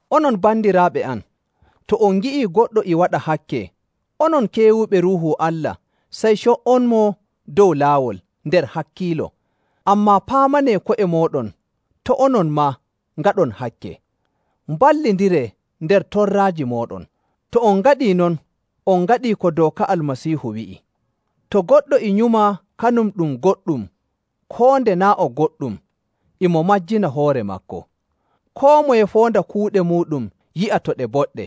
Onon bandiraaɓe am, to on ngi'ii goɗɗo e waɗa hakke, onon keewuɓe Ruuhu Allah sey co''onmo dow laawol nder hakkiilo. Ammaa paamanee ko'e mooɗon, to' onon maa ngaɗon hakke. Mballindiree nder torraaji mooɗon. To on ngaɗii non, on ngaɗii ko dooka Almasiihu wi'i. To goɗɗo e nyuma kanum ɗum goɗɗum koo nde naa' o goɗɗum, e mo majjina hoore maako. Koo moye foonda kuuɗe muuɗum yi'a to ɗe boɗɗe.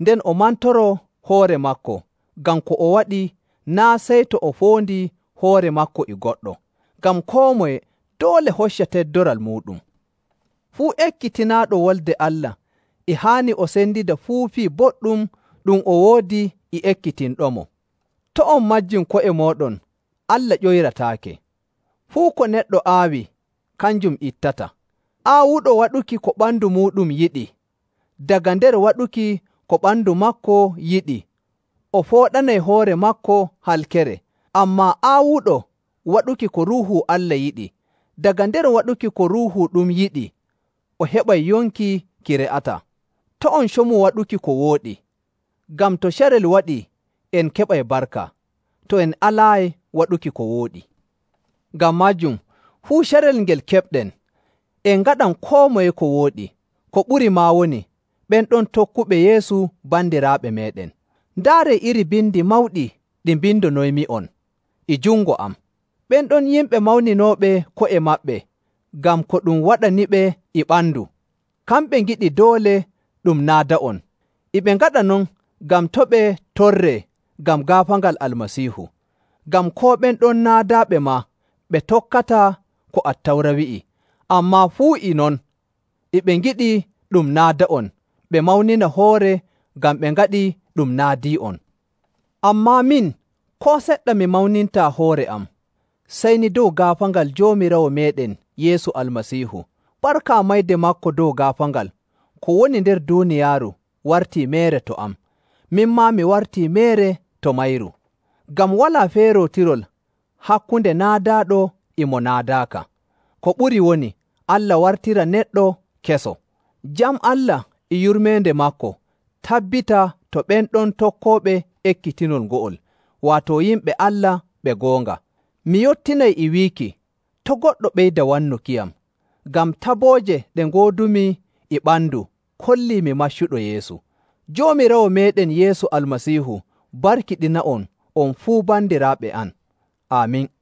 Nden o mantoroo hoore maako ngam ko o waɗi naa' sey to o foondii hoore maako e goɗɗo. Ngam koo moye doole hocca teddoral muuɗum. Fuu ekkitinaaɗo Wolde Allah e haani o sendida fuu fii boɗɗum ɗum o woodi e ekkitinɗomo. To' on majjin ko'e mooɗon, Allah ƴoyrataake. Fuu ko neɗɗo aawi, kanjum ittata. Aawuɗo waɗuki ko ɓandu muuɗum yiɗi, daga nder waɗuki ko ɓandu maako yiɗi, o fooɗanay hoore maako halkere. Ammaa aawuɗo waɗuki ko Ruuhu Allah yiɗi, daga nder waɗuki ko Ruuhu ɗum yiɗi o heɓay yonki ki re'ataa. To' en comu waɗuki ko wooɗi, ngam to carel waɗii en keɓay barka, to en alaayi waɗuki ko wooɗi. Ngam maajum fuu carel ngel keɓɗen, en ngaɗan koo moye ko wooɗi, ko ɓuri maa woni ɓen ɗon tokkuɓe Yeesu bandiraaɓe meeɗen. Ndaaree iri bindi mawɗi ɗi mbindonoymi'on e jungo am. Ɓen ɗon yimɓe mawninooɓe ko'e maɓɓe ngam ko ɗum waɗaniɓe e ɓandu, kamɓe ngiɗi doole ɗum naada'on. E ɓe ngaɗa non ngam to' ɓe torree ngam gaafaangal Almasiihu. Ngam koo ɓen ɗon naadaaɓe maa ɓe tokkataa ko Attawra wi'i, ammaa fuu e non e ɓe ngiɗi ɗum naada'on ɓe mawnina hoore ngam ɓe ngaɗii ɗum naadii'on. Ammaa min, koo seɗɗa mi mawnintaa hoore am sey ni dow gaafaangal Joomiraawo meeɗen Yeesu Almasiihu. Barka mayde maako dow gaafaangal, ko woni nder duuniyaaru wartii meere to am, min maa mi wartii meere to mayru. Ngam walaa feerootirol hakkunde naadaaɗo e mo naadaaka. Ko ɓuri woni Allah wartira neɗɗo keso. Jam Allah e yurmeende maako tabbita to ɓen ɗon tokkooɓe ekkitinol ngo'ol, waato yimɓe Allah ɓe goonga. Mi yottinay e wiiki, to' goɗɗo ɓeyda wannukiyam, ngam tabooje ɗe ngoodumi e ɓandu kollii mi maccuɗo Yeesu. Joomiraawo meeɗen Yeesu Almasiihu barkiɗina'on on fuu bandiraaɓe am. Aamin.